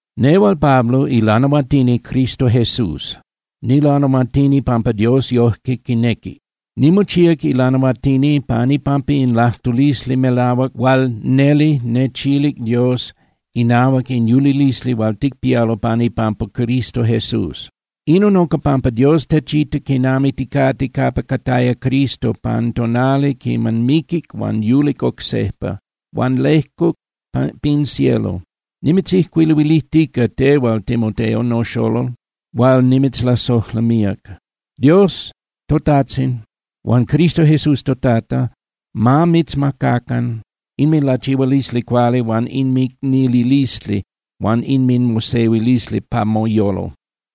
Nehual Pablo, ilanahuatini Cristo Jesús. Nilanahuatini pampa Dios yojque quinequi. Nimochíac ilanahuatini pan ipampa in lajtulisli melahuac hual neli nechilic Dios inahuac in yulilisli hual ticpialo pan ipampa Cristo Jesús. Inon unca pampa Dios techita quinami ticate capa cataya Cristo pan tonali quiman miquic huan yulic oc sejpa huan lejcuc pin cielo. Nimitzijcuiluilijtica tehual, Timoteo, noxolol hual nimitzlasojla míac. Dios toTajtzin huan Cristo Jesús toTata ma mitzmacacan inminlachihualisli cuali huan inmicnililisli huan inminmosehuilisli pa moyolo.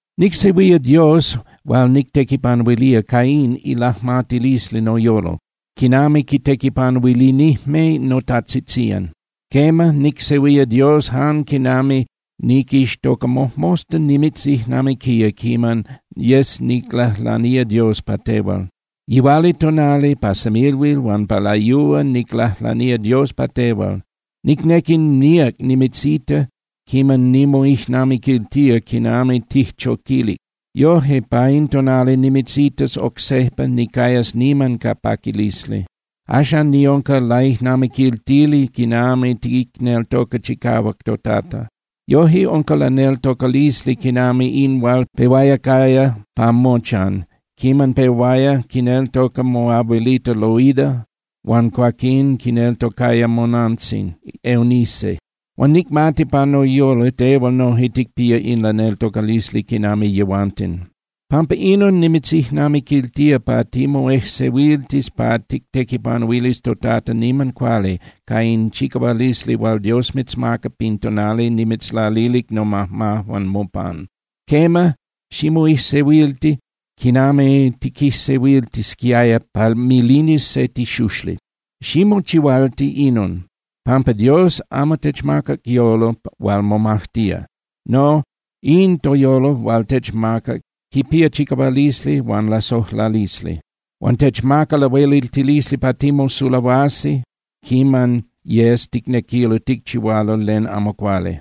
Nicsehuía Dios hual nictequipanuilía ca in ilajmatilisli noyolo, quinami quitequipanuilinijme notajtzitzían. Quema, nicsehuía Dios jan quinami niquixtoca mojmosta nimitzijnamiquía quiman yes niclajlanía Dios pa tehual. Yihualitonali, pa semilhuil huan pa layúa niclajlanía Dios pa tehual. Nicnequi míac nimitzita quiman nimoijnamiquiltía quinami tijchoquilic. Yoje, pa in tonali nimitzitas oc sejpa, nicayas niman ca paquilisli. Axan niunca laijnamiquiltili quinami ticneltoca chicahuac toTata. Yoje unca laneltocalisli quinami in hual pehuaya caya pa mochan quiman pehuaya quineltoca moabuelita Loida huan cuaquín quineltocaya monantzin Eunice. Huan nicmati pa noyolo tehual noje ticpía in laneltocalisli quinami yehuanten. Pampa inon, nimitzijnamiquiltía pa timoejsehuiltis pa tictequipanuilis toTata niman cuali ca in chicahualisli hual Dios mitzmacac pin tonali nimitzlalilic nomajmajuan mopan. Quema, ximoijsehuilti quinami tiquijsehuiltisquiaya pa milinis se tixuxli. Ximochihualti inon, pampa Dios amo techmacac yolo hual momajtía. No, in toyolo hual techmacac quipía chicahualisli huan lasojlalisli. Huan techmaca lahueliltilisli pa timosulahuasi quiman yes ticnequilo ticchihualo len amo cuali.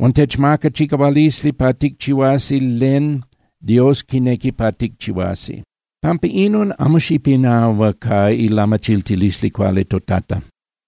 Huan techmaca chicahualisli pa ticchihuasi len Dios quinequi pa ticchihuasi. Pampa inon, amo xipinahua ca ilamachiltilisli cuali toTata.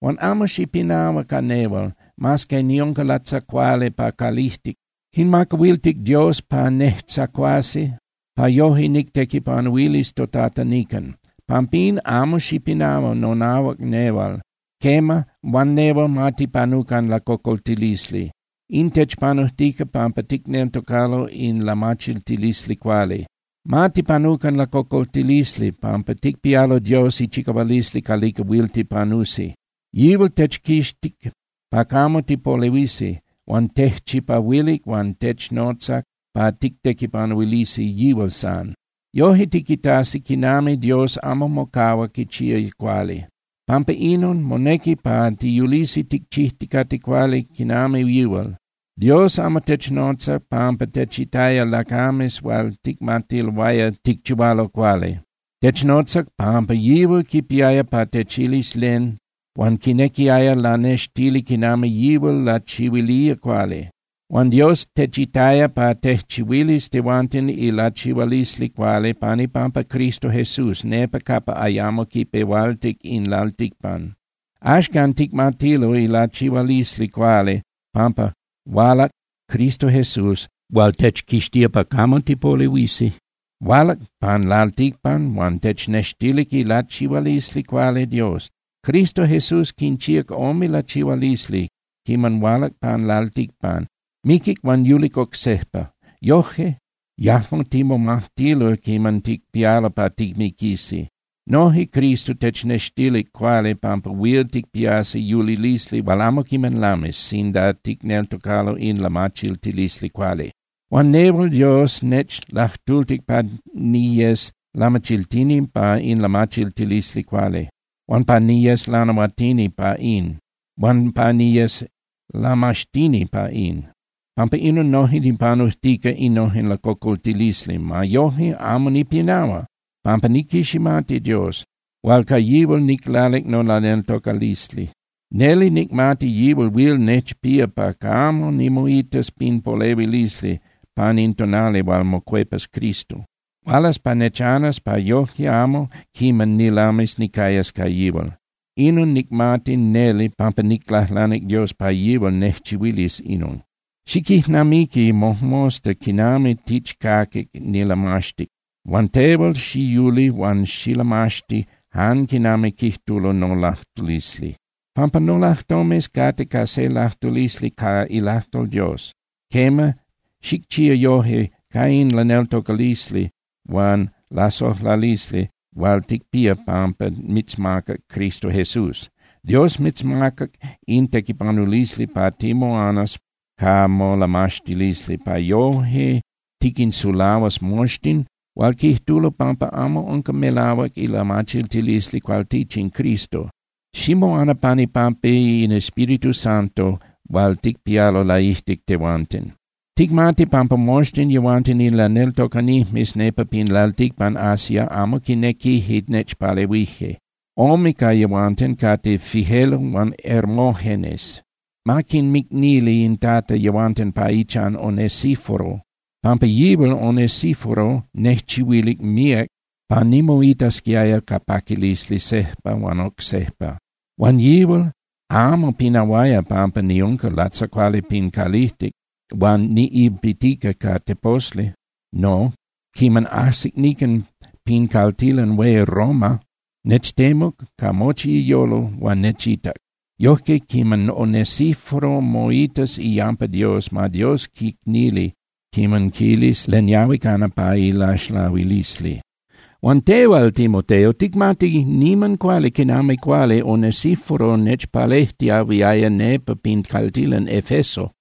Huan amo xipinahua ca nehual, mas que niunca latzacuali pa calijtic. Quinmacahuiltic Dios pa nejtzacuasi pa yoje nictequipanuilis toTata nican. Pampín, amo xipinahua nonahuac nehual. Quema, huan nehual ma tipanucan lacocoltilisli. In techpanujtica pampa ticneltocalo in lamachiltilisli cuali. Ma tipanucan lacocoltilisli, pampa ticpialo Dios ichicahualisli calica huil tipanusi. Yihual techquixtic pa camo tipolehuisi, huan tejchipahuilic huan technotzac pa tictequipanuilisi yihual san. Yoje tiquitasi quinami Dios amo mocahua quichía cuali. Pampa inon monequi pa tiyulisi ticchijticate cuali quinami yihual. Dios amo technotzac pampa techitaya lacames hual ticmatiloaya ticchihualo cuali. Technotzac pampa yihual quipiaya pa techilis len, huan quinequiaya lanextili quinami yihual lachihuilía cuali. Huan Dios techitaya pa tejchihuilis tehuanten ilachihualisli cuali pan ipampa Cristo Jesús nepa capa ayamo quipehualtic in lalticpan. Axcan ticmatilo ilachihualisli cuali pampa hualac Cristo Jesús hual techquixtía pa camo tipolehuisi. Hualac pan lalticpan huan technextilic ilachihualisli cuali Dios. Cristo Jesús quinchíac ome lachihualisli quiman hualac pan lalticpan: Miquic huan yulic oc sejpa. Yoje yajmo timomajtilo quiman ticpialo pa timiquisi. Noje Cristo technextilic cuali pampa huil ticpiasi yulilisli hual amo quiman lamis sinda ticneltocalo in lamachiltilisli cuali. Huan nehual Dios nechlajtultic pa niyes lamachiltini pa in lamachiltilisli cuali, huan pa niyes lanahuatini pa in, huan pa niyes lamaxtini pa in. Pampa inon, noje nipanujtica innojen lacocoltilisli. Ma yoje, amo nipinahua, pampa niquiximati Dios, hual ca yihual niclalic nolaneltocalisli. Neli nicmati yihual huil nechpía pa camo nimoitas pin polehuilisli pan in tonali hual mocuepas Cristo. Hualas pa nechanas pa yoje amo quiman nilamis nicayas ca yihual. Inon nicmati neli pampa niclajlanic Dios pa yihual nejchihuilis inon. Xiquijnamiqui mojmosta quinami tichcaquic nilamaxtic, huan tehual xiyuli huan xilamaxti jan quinami quijtulo nolajtulisli, pampa nolajtomes cate ca se lajtulisli ca ilajtol Dios. Quema, xicchía yoje ca in laneltocalisli huan lasojlalisli hual ticpía pampa mitzmacac Cristo Jesús. Dios mitzmacac in tequipanulisli pa timoanas ca molamaxtilisli pa yoje tiquinsulahuas moxtin hual quijtulo pampa amo unca melahuac ilamachiltilisli cualtichin Cristo. Ximoana pan ipampa in Espíritu Santo hual ticpialo laijtic tehuanten. Ticmati pampa moxtin yehuanten in laneltocanijmes nepa pin lalticpan Asia amo quinequije nechpalehuije. Ome ca yehuanten cate Figelo huan Hermógenes. Ma quinmicnili in Tata yehuanten pa ichan Onesíforo, pampa yihual Onesíforo nejchihuilic míac pa nimoitasquiaya ca paquilisli sejpa huan oc sejpa. Huan yihual amo pinahuaya pampa niunca latzacuali pin calijtic huan niꞌilpitica ca teposli. No, quiman ajsic nican pin caltilan hué Roma, nechtemuc ca mochi iyolo huan nechitac. Yojque quiman Onesíforo moitas iyampa Dios, ma Dios quicnili quiman quilis len yahui cana pa ilaxlahuilisli. Huan tehual, Timoteo, ticmati niman cuali quinami cuali Onesíforo nechpalejtiahuiaya nepa pin caltilan Efeso.